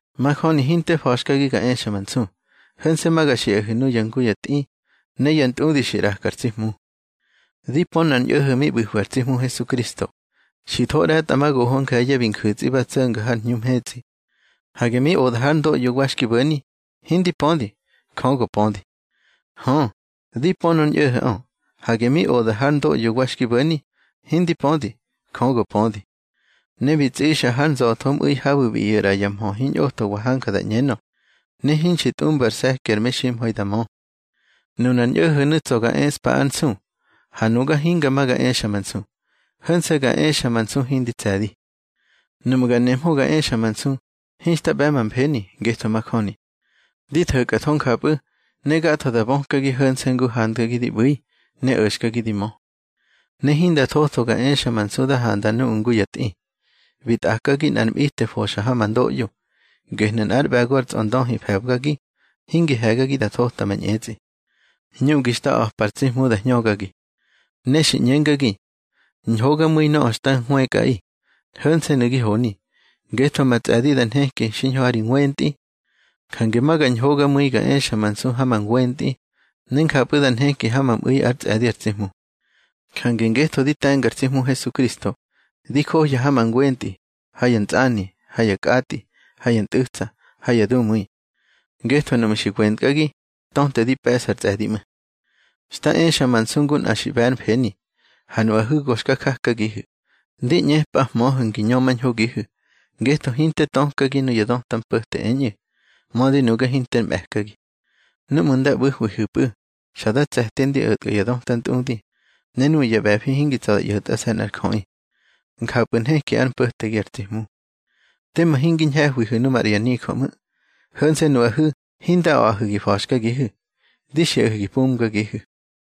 Majöni hinte fa̱xkagi ga exa ma nsu. Ho̱nse̱ ma ga xiꞌahu̱ nuya ngu ya tꞌi ne ya ntꞌudi xi ꞌraka ar tsi Hmu. Di pö nꞌar ñꞌo̱ho̱ mi ꞌbu̱hwi ar tsi Hmu Hesukristo, xi tho ꞌre̱tꞌamagoho nje̱ye̱ bi nju̱tsꞌi ba tso̱nga har hñu mhetsꞌi. Hage mi oda hár ndoꞌyo wa xki bo̱ni, hindi pödi. Jö go pödi. Hö, di pö nor ñꞌo̱ho̱ꞌö. Hage mi oda hár ndoꞌyo wa xki bo̱ni, hindi pödi. Jö go pödi. Ne bi tsꞌixa har nza̱thomꞌu̱i habu̱ bi ꞌyo̱ ꞌra ya mhö hiñꞌothowa hanja da ꞌñenö, ne hinxi tꞌumba ar se̱ki ar meximha̱i da mö. Nunar ñꞌo̱ho̱nu̱ tsa̱ ga eꞌspa ár nsu. Ha nuga hinga ma ga exa ma nsu, ho̱nse̱ ga exa ma nsu hindi tse̱di. Nuꞌmu̱ ga nemhö ga exa ma nsu, hinxta ꞌbe̱ ma mfeni, ngetho majöni. Di tho̱kꞌatho njapꞌu̱, ne gatho da bökagi ho̱nse̱ ngu handgagi di ꞌbu̱i, ne o̱xkagi di mö. Ne hinda thotho ga exa ma nsu da handa nuꞌu̱ ngu ya tꞌi, bi tꞌakagi nꞌar mꞌite foxa ha ma ndoꞌyo. Gehnu̱ nꞌár ꞌbe̱go ar tsꞌondöhi fe̱bgagi, hingi he̱gagi da thota ma ñꞌetsꞌi. Hñuꞌgi xta a̱pa ar tsi Hmu da hñögagi. Ne xi ꞌñengagi: Ñhogamu̱i nöꞌö xta hwëkꞌaꞌi, ho̱nse̱nu̱ gi honi. Ngetho ma tsꞌe̱di da nheki xiñho ha ri ngwentꞌi. Jange ma ga ñhogamu̱i ga exa ma nsu ha ma ngwentꞌi, ne njapꞌu̱ da nheki ha ma mꞌu̱i ár tsꞌe̱di ar tsi Hmu. Jange ngetho di te̱nga ar tsi Hmu Hesukristo, di johya ha ma ngwentꞌi, ha ya ntsꞌani, ha ya kꞌatꞌi, ha ya ntꞌu̱tsa, ha ya dumu̱i. Ngetho núꞌmu̱ xi wentkꞌagi, töte di pe̱ꞌsa ar tsꞌe̱di ꞌmu̱. Xta exa ma nsu ngu nꞌa xi ꞌbe̱ ár mfeni. Ha nuꞌahu̱ go ga jakagihu̱, ndi ꞌñepꞌahmöhu̱ ngi ñömañhogihu̱. Ngetho hinte tökagi nuya döta mpo̱te eñꞌu̱, mödi nuga hinter mꞌe̱kagi. Núꞌmu̱ nda ꞌbu̱hwihu̱pꞌu̱, xa da tse̱ti ndi o̱tkꞌa ya döta ntꞌudi, ne nuꞌu̱ ya ꞌbe̱fi hingi tsa̱ da ꞌyo̱tꞌase̱ nꞌar jöꞌi. Njapꞌu̱ nheki ár mpo̱tegi ar tsi Hmu. Tema hingi ñhe̱hwihu̱ nu maꞌra ya nijö ꞌmu̱. Ho̱nse̱ nuꞌahu̱ hinda a̱ꞌahu̱ gi fa̱xkagihu̱. Di xiꞌahu̱ gi pumgagihu̱.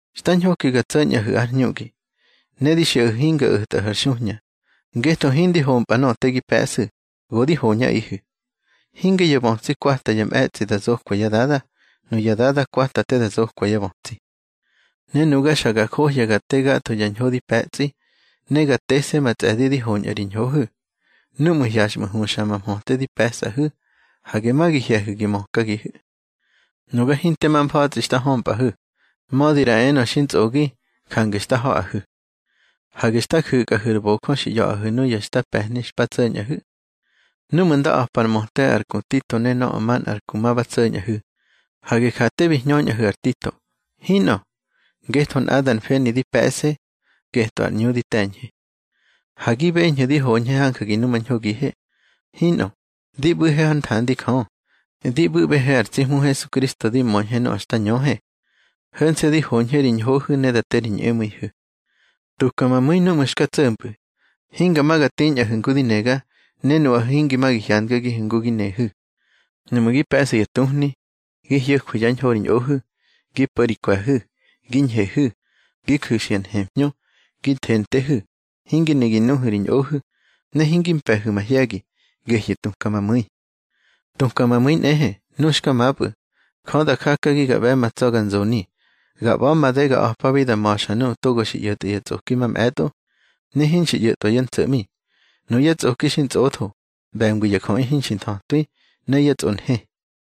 Xta ñhoki ga tso̱ñꞌahu̱ ár hñuꞌgi. Ne di xiꞌahu̱ hinga o̱tꞌahu̱ ar xuhña, ngetho hindi hompꞌa nöꞌö te gi pe̱ꞌsu̱, go di hoñꞌaꞌihu̱. Hinge ya bötsi kwata ya mꞌe̱tsꞌi da zokwa yá dada, nuyá dada kwata te da zokwa yá bötsi. Ne nuga xa ga njohya ga te gatho ya ñho di pe̱tsꞌi, ne ga tese̱ ma tsꞌe̱di di hoñꞌa ri ñhohu̱. Núꞌmu̱ hyaxꞌmu̱ huxa ma mhöte di pe̱sꞌahu̱, hage ma gi hye̱hu̱ gi mökagihu̱. Nuga hinte ma mfa̱tsꞌi xta hömpꞌahu̱, mödi ꞌra enö xi ntsꞌogi, jange xta ha̱ꞌahu̱. Hage xta ju̱kꞌahu̱ ar bojö xi ꞌya̱ꞌahu̱ nuya xta pe̱hni xpa tso̱ñꞌahu̱. Núꞌmu̱ nda a̱pa ar möte ar ku Tito ne nöꞌö manꞌar ku ma ba tso̱ñꞌahu̱, hage ja te bi hñöñꞌahu̱ ar Tito. Hinꞌö. Ngetho nꞌadar mfeni di pe̱ꞌse, getꞌö ar ꞌñu di te̱ñhe. Ha gi beñhu̱ di hoñhe hanja gi numañhogihe. Hinꞌö. Di ꞌbu̱he hár nthandi Jö, di ꞌbu̱ꞌbehe ar tsi Hmu Hesukristo di möñhe nöꞌö xta ñöhe. Ho̱nse̱ di hoñhe ri ñhohu̱ ne da te ri ñꞌemu̱ihu̱. Tuka ma mu̱i núꞌmu̱ xka tso̱mpꞌu̱, hinga ma ga tiñꞌahu̱ ngu di nega, ne nuꞌahu̱ hingi ma gi hyandagihu̱ ngu gi nehu̱. Nuꞌmu̱ gi pe̱ꞌsu̱ ya tuhni, gi hyo̱jwu̱ yá ñho ri ñꞌohu̱, gi po̱ ri kwe̱hu̱, gi ñhehu̱, gi ju̱xu̱ ya nhemhñö, gi thentehu̱, hingi ne gi nuhu̱ ri ñꞌohu̱, ne hingi mpe̱hu̱ mahye̱gi, gehnu̱ tuka ma mu̱i. Tuka ma mu̱i nꞌehe, nu xka mapꞌu̱, Jö da jakagi ga ꞌbe̱ ma tsa̱ ga nzoni. Ga ꞌba̱ made ga a̱pabi da ma̱xa nuꞌu̱ togo xi ꞌyo̱tꞌa ya tsꞌoki mamꞌe̱tꞌo, ne hinxi ꞌyo̱tꞌwa yá ntso̱ꞌmi. Nuyá tsꞌoki xi ntsꞌotho, ꞌbe̱ngwi ya jöꞌi hinxi nthötwi, ne yá tsꞌonhe.